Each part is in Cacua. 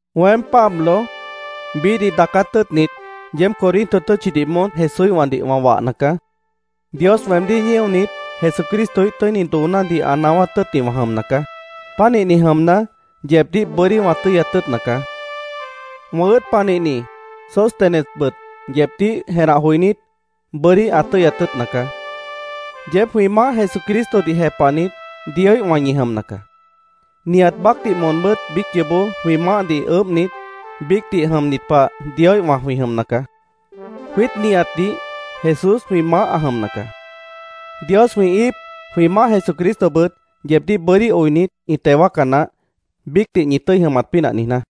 Weém, Pablo, biíhdih daacát tʉ́ʉtnit, yeéb Corinto tʉ́tchidih moón Jesúíhwãdih wã wahna caá. Dios weemdíh ñíonit, Jesucristoíh tʉ́ini doonádih ã naáwát tʉ́ʉtni wã jʉmna caá. Pánihni jʉmna, yeebdíh bʉ́dí wã tʉ́yat tʉ́ʉtna caá. Wã ʉ́ʉd panihni Sóstenesbʉt yeebdíh jenah joinít, bʉ́dí ã tʉ́yat tʉ́ʉtna caá. Yeéb jwĩ Maáh Jesucristodih jepahnit, Dioíhwã ñi jʉmna caá. Nihat baácdih moonbʉ́t biíc yoobó jwĩ maáhdih ʉʉ́bhnit, biícdih jʉmnit pah Dioíhwã jwĩ jʉmna caá. Jwiít nihatdih Jesús jwĩ Maáh ã jʉmna caá. Dios jwĩ íip, jwĩ Maáh Jesucristobʉt yeebdíh bʉ́dí oinit, ĩ teo wáaca naáh, biícdih ñi tʉ́i jʉmat pínah niijná.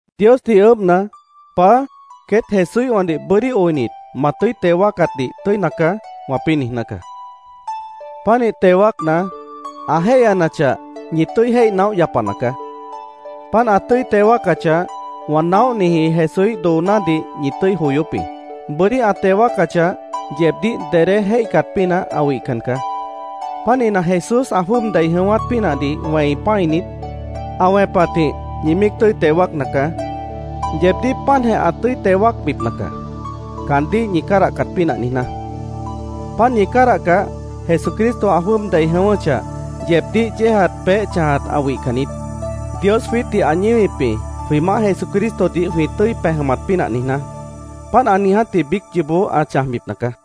Diosdih ʉʉ́bhna, “Paá, queét Jesúíhwãdih bʉ́dí oinit, ma tʉ́i teo wáacatdih tʉ́ina caá”, wãpĩ́ niijná caá. Pánih teo wáacna, ã jéihyanachah, ñi tʉ́i jéih naóh yapana caá. Páant ã tʉ́i teo wáacachah, wã naóhniji Jesúíh doonádih ñi tʉ́i joyóp jĩ. Bʉ́dí ã teo wáacachah, yeebdíh dedé jéihcat pínah ã wihcan caá. Pánihna, Jesús ã jwʉ́ʉb dei jʉ̃ʉ́wát pínahdih wẽi pã́init, ã wẽpatjĩh ñi míic tʉ́i teo wáacna caá. Yeebdíh páantjeh ã tʉ́i teo wáacbipna caá, caandíh ñi cádahcat pínah niijná. Páant ñi cádahcah, Jesucristo ã jwʉ́ʉb dei jʉ̃ʉ́wʉ́chah, yeebdíh yéejat peéh chãjat ã wihcan niít. Dios jwiítdih ã ñíwip jĩ, jwĩ Maáh Jesucristodih jwĩ tʉ́i pej jʉmat pínah niijná. Páant ã niijátji biíc yoobó ã chãjbipna caá.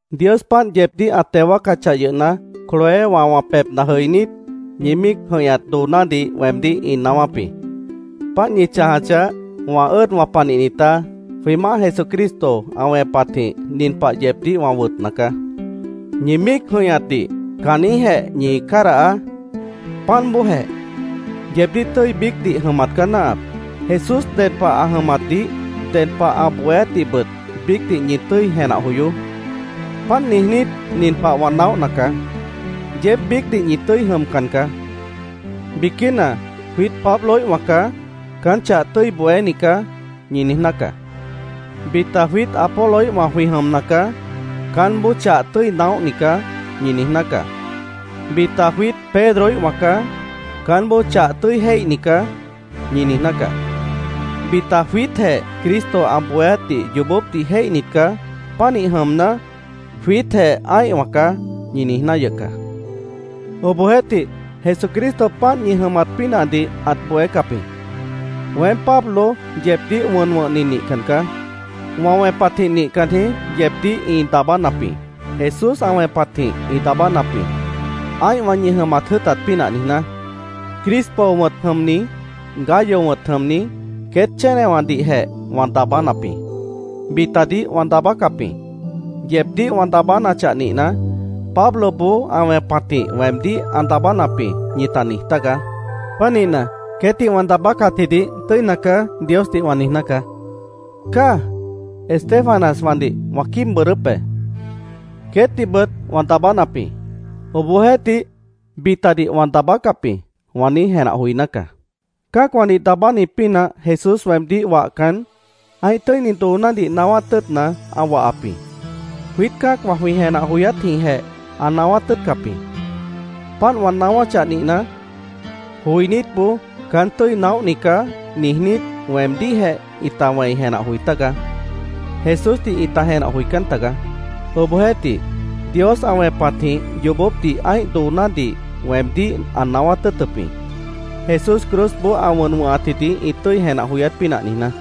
Dios páant yeebdíh ã teo wáacachah yʉhna, Cloéwã wã pebhna jʉinít, ñi míic jʉ̃ihñat doonádih weemdíh ĩ naáwáp jĩ. Páant ñi chãjachah, wã ʉ́ʉdwã panihnitá, jwĩ Maáh Jesucristo ã wẽpatjĩh nin pah yeebdíh wã wʉtna caá: ¡Ñi míic jʉ̃ihñatdih caanjĩ́hjeh ñi cádahaá! ¡Páant bóojeh! Yeebdíh tʉ́i biícdih jʉmat caá náahap. Jesús ded pah ã jʉmatdih, ded pah ã bohéátdihbʉt biícdih ñi tʉ́i jenah joyoó. Páant niijnít, nin pah wã naóhna caá. Yeéb biícdih ñi tʉ́i jʉmcan caá. Biquína, “Jwiít Pabloíhwã caá. Caán chah tʉ́i bohéni caá”, ñi niijná caá. Bita, “Jwiít Apoloíhwã jwĩ jʉmna caá. Caánboó chah tʉ́i naóhni caá”, ñi niijná caá. Bita, “Jwiít Pedroíhwã caá. Caánboó chah tʉ́i jéihni caá”, ñi niijná caá. Bita “Jwiítjeh Cristo ã bohéátdih yoobópdih jéihnit caá. Pánih jʉmna, jwiítjeh ã́ihwã caá”, ñi niijná yʉh caá. Obohjeéhtih, Jesucristo páant ñi jʉmat pínahdih ãt bohécap jĩ. Weém, Pablo, yeebdíh wʉn wʉ̃hni nihcan caá. Wã wẽpatjĩh nihcan jĩí yeebdíh ĩ daabánap jĩ. Jesús ã wẽpatjĩh ĩ daabánap jĩ, ã́ihwã ñi jʉmat jʉ́ʉtat pínah niijná. Crispo wʉ̃t jʉmni, Gayo wʉ̃t jʉmni, queét chénewãdihjeh wã daabánap jĩ. Bitadih wã daabácap jĩ. Yeebdíh wã daabánachah nihna, “Pabloboó ã wẽpatjĩh weemdíh ã daabánap jĩ”, ñita niij tágaá. Pánihna, “Queétdih wã daabácatjidih tʉ́ina caá”, Diosdih wã niijná caá. ¡Cáaj! Estéfanaswãdih wã quíib bʉʉdʉ́p be. Queétdihbʉt wã daabánap jĩ. Obohjeéhtih, “Bitadih wã daabácap jĩ”, wã niíj jenah joiná caá. Cã́acwãdih daabáni pínah Jesús weemdíh wahcan, ã́ih tʉ́ini doonádih naáwát tʉ́ʉtna, ã wahap jĩ. Jwiít cã́acwã jwĩ jenah joyátjĩhjeh ã naáwát tʉ́ʉtcap jĩ. Páant wã naáwáchah nihna, joinítboó “Caán tʉ́i naóhni caá”, niijnít, weemdíhjeh ĩta wẽi jenah joi tága. Jesúsdih ĩta jenah joicán taga. Obohjeéhtih, Dios ã wẽpatjĩh yoobópdih ã́ih doonádih weemdíh ã naáwát tʉ́ʉtʉp jĩ, Jesús cruzboó ã wʉn wʉ̃hatjidih ĩ tʉ́i jenah joyát pínah niijná.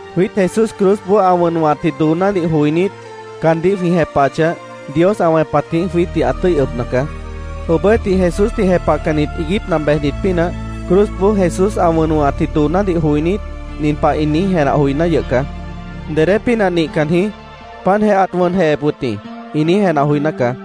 Jwiít Jesús cruzboó ã wʉn wʉ̃hatji doonádih joinít, caandíh jwĩ jepahachah, Dios ã wẽpatjĩh jwiítdih ã tʉ́i ʉbna caá. Obohjeéhtih, Jesúsdih jepahcannit iiguípna bejnit pínah, cruzboó Jesús ã wʉn wʉ̃hatji doonádih joinít, nin pah ĩ niíj jenah joiná yʉh caá: “Dedé pínah nihcan jĩí. Páantjeh ãt wʉnjehep wʉt jĩ”, ĩ niíj jenah joiná caá.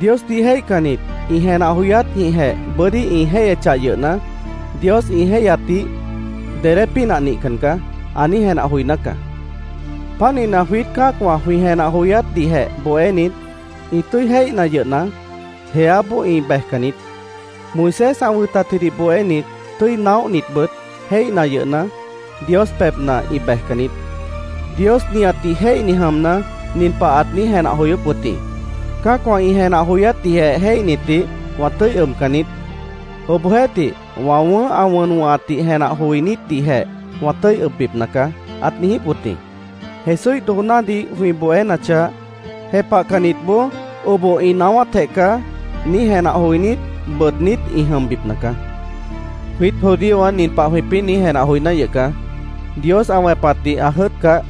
Diosdih jéihcannit ĩ jenah joyátjĩhjeh bʉ́dí ĩ jéihyechah yʉhna, Dios ĩ jéihyatdih “Dedé pínah nihcan caá”, ã niíj jenah joiná caá. Pánihna, jwiít cã́acwã jwĩ jenah joyátdihjeh bohénit, ĩ tʉ́i jéihna yʉhna, jeáboó ĩ bejcan niít. Moisés ã wʉtatjidih bohénit, tʉ́i naóhnitbʉt jéihna yʉhna, Dios pebhna ĩ bejcan niít. Dios nihatdih jéihni jʉmna, nin pah ãt niíj jenah joyóp wʉt jĩ: “Cã́acwã ĩ jenah joyátdihjeh jéihnitdih wã tʉ́i ʉbcan niít. Obohjeéhtih, wã wʉ̃ʉ́h ã wʉn wʉ̃hatdih jenah joinítdihjeh wã tʉ́i ʉbbipna caá”, ãt niijíp wʉt jĩ. Jesúíh doonádih jwĩ bohénachah, jepahcannitboó “Oboh ĩ naáwátjeh caá”, niíj jenah joinít, bʉʉdnít ĩ jʉmbipna caá. Jwiít judíowã nin pah jwĩpĩ́ niíj jenah joiná yʉh caá: “Dios ã wẽpatdih ã jʉ́ʉtcah,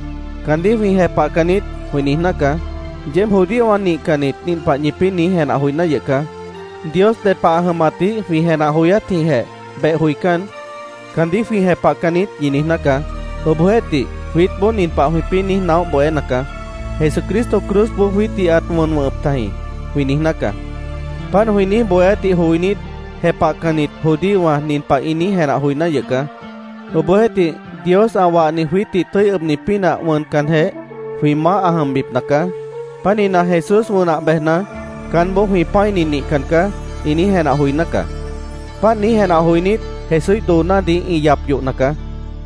caandíh jwĩ jepahcan niít”, jwĩ niijná caá. Yeéb judíowã nihcannit nin pah ñipĩ́ niíj jenah joiná yʉh caá: “Dios ded pah ã jʉmatdih jwĩ jenah joyátjĩhjeh beh joicán, caandíh jwĩ jepahcan niít”, ñi niijná caá. Obohjeéhtih, jwiítboó nin pah jwĩpĩ́ niíj naóh bohéna caá: “Jesucristo cruzboó jwiítdih ãt wʉn wʉ̃hʉp tajĩ”, jwĩ niijná caá. Páant jwĩ niíj bohéátdih joinít, jepahcannit judíowã nin pah ĩ niíj jenah joiná yʉh caá: “Obohjeéhtih, Dios ã wahni jwiítdih tʉ́i ʉbni pínah wʉncanjeh, jwĩ maáh ã jʉmbipna caá. Pánihna, Jesús wʉnah bejna, caánboó jwĩ pã́ini nihcan caá”, ĩ niíj jenah joiná caá. Páant niíj jenah joinít, Jesúíh doonádih ĩ yap yohna caá.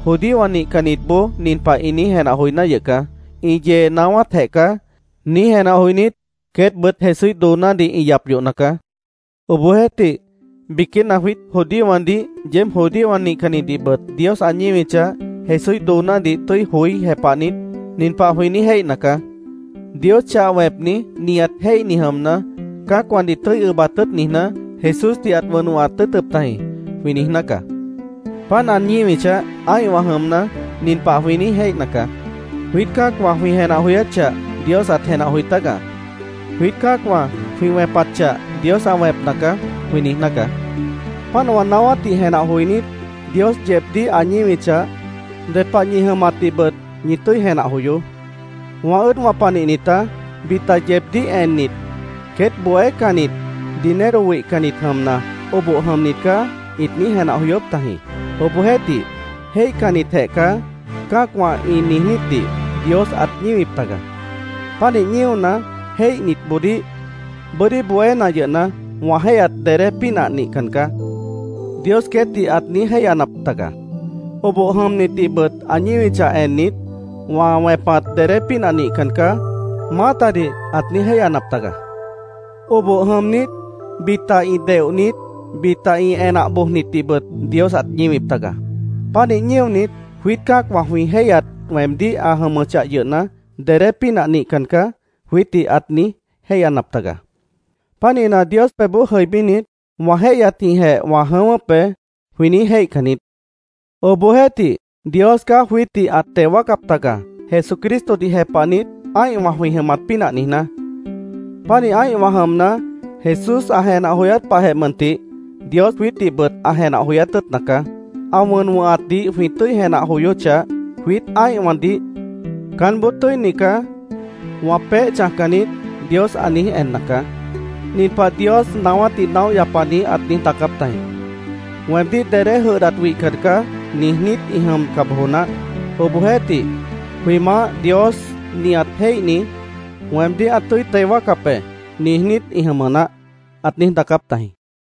Judíowã nihcannitboó nin pah ĩ niíj jenah joiná yʉh caá: “Ĩ yee naáwátjeh caá”, niíj jenah joinít, queétbʉt Jesúíh doonádih ĩ yap yohna caá. Obohjeéhtih, biquína jwiít judíowãdih, yeéb judíowã nihcannitdihbʉt Dios ã ñíwichah, Jesúíh doonádih tʉ́i joí jepahnit, nin pah jwĩ niíj jéihna caá: “Dios chah wẽpni, nihat jéihni jʉmna, cã́acwãdih tʉ́i ʉbat tʉ́ʉt niijná, Jesúsdih ãt wʉn wʉ̃hat tʉ́ʉtʉp tajĩ”, jwĩ niijná caá. Páant ã ñíwichah, ã́ihwã jʉmna, nin pah jwĩ niíj jéihna caá: “Jwiít cã́acwã jwĩ jenah joyát chah Dios ãt jenah joi tága. Jwiít cã́acwã jwĩ wẽpat chah Dios ã wẽpna caá”, jwĩ niijná caá. Páant wã naáwátdih jenah joinít, Dios yeebdíh ã ñíwichah, ded pah ñi jʉmatdihbʉt ñi tʉ́i jenah joyoó. Wã ʉ́ʉdwã panihnitá, bita yeebdíh ennit, “Queét bohécannit, dinero wihcannit jʉmna, oboh jʉmnit caá”, ĩt niíj jenah joyóp tajĩ. Obohjeéhtih, “Jéihcannitjeh caá”, cã́acwã ĩ niijnítdih Dios ãt ñíwip taga. Pánih ñíona, jéihnitboodíh “Bʉ́dí bohéna yʉhna, wã jéihyat dedé pínah nihcan caá”, Dios queétdih ãt niíj jéihyanap taga. Oboh jʉmnitdihbʉt ã ñíwichah ennit, “Wã wẽpat dedé pínah nihcan caá”, maátadih ãt niíj jéihyanap taga. Oboh jʉmnit, bita ĩ deohnit, bita ĩ enah bojnitdihbʉt Dios ãt ñíwip taga. Pánih ñíonit, “Jwiít cã́acwã jwĩ jéihyat weemdíh ã jʉmʉchah yʉhna, dedé pínah nihcan caá”, jwiítdih ãt niíj jéihyanap taga. Pánihna, Dios pebhboó jʉibínit, “Wã jéihyatjĩhjeh wã jʉ̃ʉ́wʉ́p be”, jwĩ niíj jéihcan niít. Obohjeéhtih, Dios caá jwiítdih ãt teo wáacap taga, Jesucristodih jepahnit, ã́ihwã jwĩ jʉmat pínah niijná. Pánih ã́ihwã jʉmna, Jesús ã jenah joyát pahjeh mʉntih Dios jwiítdihbʉt ã jenah joyát tʉ́ʉtna caá. Ã wʉn wʉ̃hatdih jwĩ tʉ́i jenah joyóchah, jwiít ã́ihwãdih “Caánboó tʉ́ini caá. Wã peéh chãjcan niít”, Dios ã niíj enna caá. Nin pah Dios naáwátdih naóh yapani ãt niíj daacáp tajĩ: “ ‘Weemdíh dedé jʉdhdat wihcan caá’, niijnít ĩ jʉmca bojo naáh. Obohjeéhtih ‘Jwĩ Maáh Dios nihat jéihni, weemdíh ã tʉ́i teo wáacap be’, niijnít ĩ jʉmʉ naáh”, ãt niíj daacáp tajĩ.